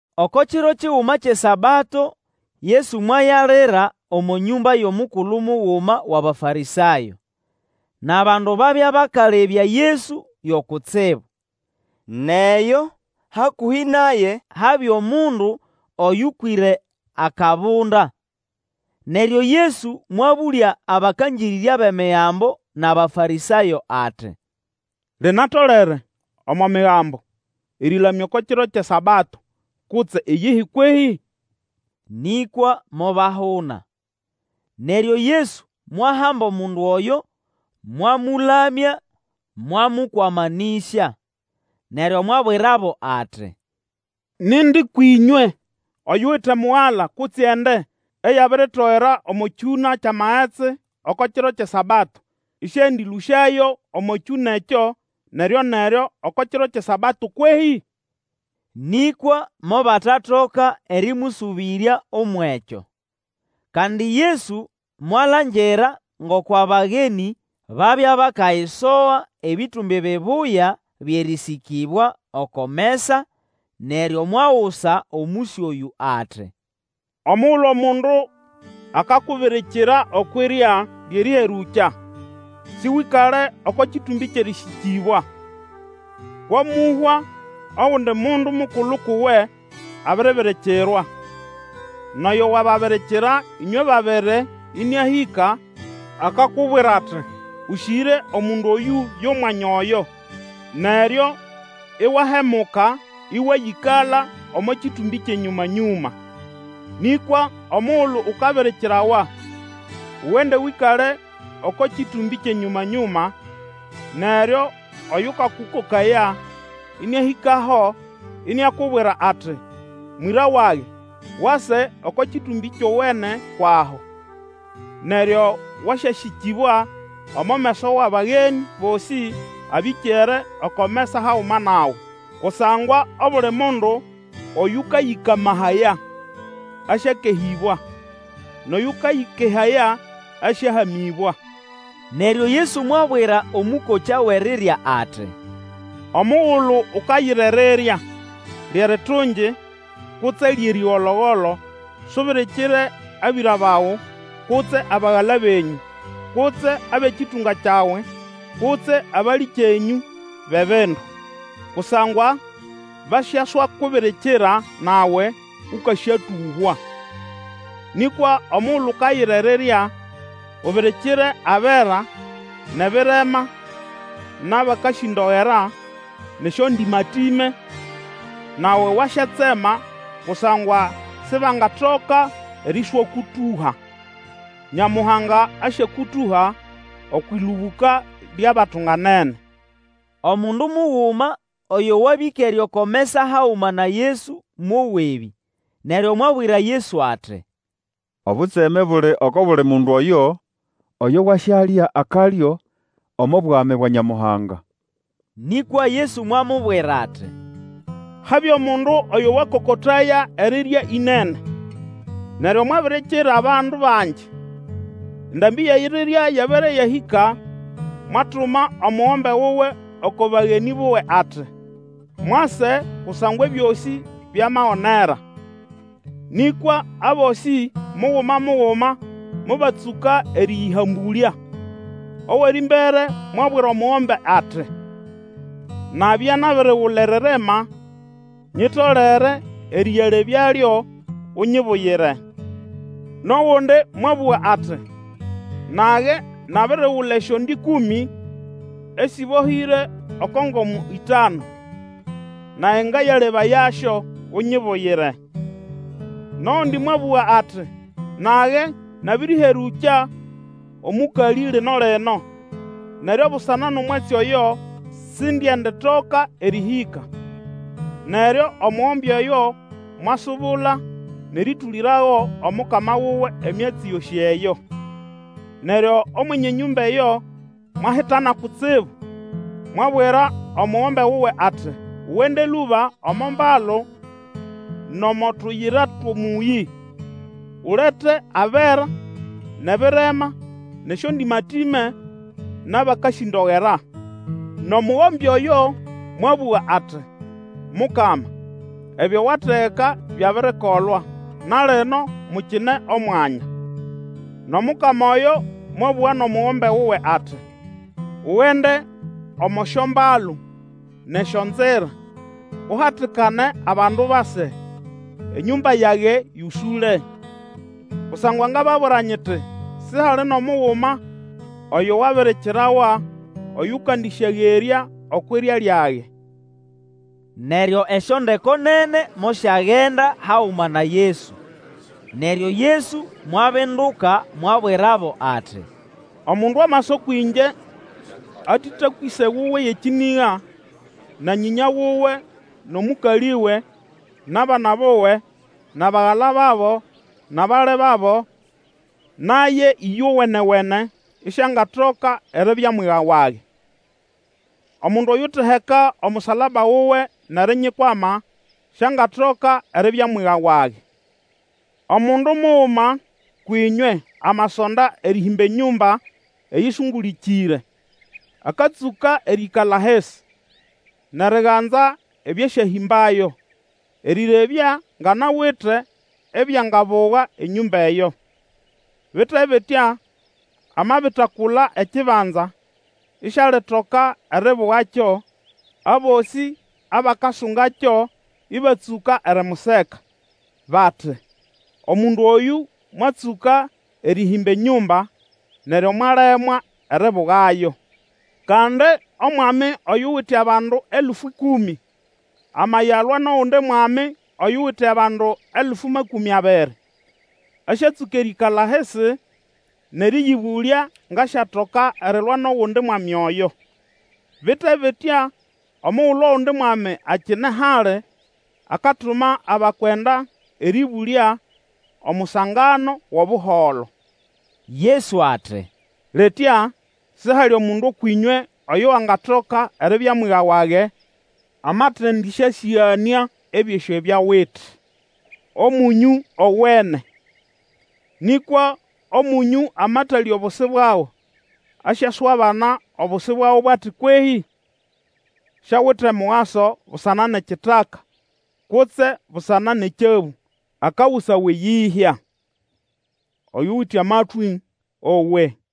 Oko kiro kiguma kyʼeSabato Yesu mwayalira omo nyũmba yʼomukulu muguma wʼAbafarĩsayo; nʼabandu babya bakalebya Yesu yo kutsibu. Nʼeyo, hakũhĩ naye habya omundu oyũkwĩre akabunda. Neryo Yesu mwabũlya abakangĩrĩrya bʼEmigambo nʼAbafarĩsayo; ati, Linatolere omo Migambo erĩlamya oko kiro kyʼeSabato kutse iyihi kwehĩ? Nĩkwa mobahuna. Neryo Yesu mwahamba omundu oyo, mwamũlamya, mwamũkwamanĩsya. Neryo mwabwirabo ati, Nindi kwĩnywe oyuwite mugala kutse ende eyabiritogera omo kyũna kyʼamagetsi oko kiro kyʼeSabato, ĩsĩendĩlũsyayo omo kyũna ekyo neryo-neryo, oko kiro kyʼeSabato kwehĩ? Nĩkwa mobatatoka erĩmũsũbĩrya umwʼekyo. Kandi Yesu mwalangira ngoko abagenĩ babya bakayisoga ebĩtũmbĩ bibuya byʼerĩsĩkĩbwa oko mesa, neryo mwagusa omũsyo oyũ ati, Omugulu omundu akakubirikira okwʼirya lyʼerĩherũkya, sĩwĩkale oko kĩtũmbĩ kyʼerĩsĩkĩbwa. Kwamũhwa ogundi mundu omukulu kuwe abiribirikirwa, nʼoyo wababirikira ĩnywe babiri ĩnĩahĩka akakubwira ati, Ũsĩgĩre omundu oyũ yʼomwanya oyo. Neryo iwahemuka ĩwayĩkala omo kĩtũmbĩ kyʼenyũma-nyũma. Nĩkwa omugulu ukabirikirawa, ugende Wĩkale oko kĩtũmbĩ kyʼenyũma-nyũma, neryo oyũkakũkokaya ĩnĩahĩkaho iniakubwira ati, Mwĩra wage, wase oko kĩtũmbĩ kyowene kwʼaho. Neryo wasyasĩkĩbwa omo meso wʼabagenĩ bosĩ abĩkere oko mesa haguma nawe. Kusangwa obuli mundu oyũkayĩkamahaya, asyakehĩbwa, nʼoyũkayĩkehaya, asyahamĩbwa. Neryo Yesu mwabwira omũkokya wʼerirya ati, Omugulu ukayira erirya, lyʼeritungi kutse lyʼerĩgolo-golo, subirikire abĩra bawe kutse abagala benyũ, kutse abʼekĩtũnga kyawe kutse abalĩkyenyũ bʼebindu, kusangwa basyaswakubirikira nawe, ũkasyatũhwa. Nĩkwa omugulu ukayira erirya, ubirikire abera, nʼebirema, nʼabakasĩndogera, nʼesyondĩmatĩme, nawe wasyatsema; kusangwa sibangatoka erĩswakũtũha. Nyamuhanga asyakũtũha okwʼĩlũbũka lyʼabatunganene. Omundu muguma oyo wabya ĩkere oko mesa haguma na Yesu mowa ebi, neryo mwabwira Yesu ati, Obutseme buli oko buli mundu oyo wasyalya akalyo omo Bwami bwa Nyamuhanga! Nĩkwa Yesu mwamubwira ati, Habya omundu oyo wakokotaya erirya ĩnene, neryo mwabirikira bandu bangi. Endambĩ yʼerirya yabere yahĩka mwatuma omugombe wuwe oko bagenĩ buwe ati, Mwase, kusangwa ebyosĩ byamagonera! Nĩkwa abosĩ muguma muguma mobatsũka erĩyĩhambũlya. Owʼerĩmbere mwabwira omugombe ati, Nabya nabirigula eririma, nyitolere erĩyalebyalyo; unyibuyire. Nʼogundi mwabũga ati, Nage nabirigula esyonde ĩkũmĩ esĩbohĩre oko ngomo ĩtanu, nage ngayalebayasyo, unyibuyire. Nʼogundi mwabũga ati, Nage nabĩrĩherũkya omũkalĩ lino-lino, neryo busana nʼomwatsi oyo sindyenditoka erĩhĩka. Neryo omugombe oyo mwasubula nʼerĩtũlĩrago omukama wuwe emyatsi yosĩ eyo. Neryo Omwenye enyũmba eyo mwahitana kutsibu, mwabwira omugombe wuwe ati, Ugende lũba omo mbalu nʼomo tuyira twʼomũyĩ, ulete abera, nʼebirema, nʼesyondĩmatĩme, nʼabakasĩndogera. Nʼomugombe oyo mwabũga ati, Mukama, ebyo wategeka byabirikolwa na lino mukine omwanya. Nʼomukama oyo mwabũga nʼomugombe wuwe ati, Ugende omo syombalu nʼesyonzira, uhatikane abandu base, enyũmba yage yosũle. Kusangwa ngababwira nyiti, Sihali nʼomuguma oyo wabirikirawa oyũkandĩsyagerya okwʼirya lyage. Neryo esyondeko nene mosyagenda haguma na Yesu. Neryo Yesu mwabinduka mwabwirabo ati, Omundu amasa kwĩngye atetakwa ĩse wuwe yʼekĩnĩga, na nyĩnya wuwe nʼomũkalĩwe, nʼabana buwe, nʼabagala babo, nʼabali babo, naye ĩyowene-wene, isiangatoka eribya mwiga wage. Omundu oyuteheka omusalaba wuwe nʼerinyikwama, siangatoka eribya mwiga wage. Omundu muguma kwĩnywe amasonda erĩhĩmba enyũmba eyĩsũngũlĩkĩre akatsũka erĩĩkala ahisi nʼeriganza ebyasyahĩmbayo erĩrebya ngʼanawite ebyangabuga enyũmba eyo. Bite bitya, amabitakula ekibanza, isialitoka eribugakyo, abosĩ abakasungakyo ĩbatsũka erimuseka, bati, Omundu oyũ mwatsũka erĩhĩmba enyũmba, neryo mwalemwa eribugayo. Kandi omwami oyuwite abandu elfu ĩkũmĩ, amayalwa nʼogundi mwami oyuwite abandu elfu makũmĩ abiri, asyatsũka erĩĩkala ahisi nʼerĩyĩbũlya ngʼasyatoka erilwa nʼogundi mwami oyo. Bite bitya, omugulu ogundi mwami akine hali, akatuma abakwenda erĩbũlya omusangano wʼobuholo. Yesu ati, Litya sihali mundu ũkwʼĩnywe oyo wangatoka eribya mwiga wage amatendĩsyasĩganĩa ebyosĩ ebyo awite. Omũnyũ owene; nĩkwa omũnyũ amatalya obusi bwago, asyaswabana obusi bwago bo ati kwehĩ? Siawite mugaso busana nʼekitaka, kutse busana nʼekyabũ. Akagusawa eyĩhya. Oyuwite amatwĩ, owe.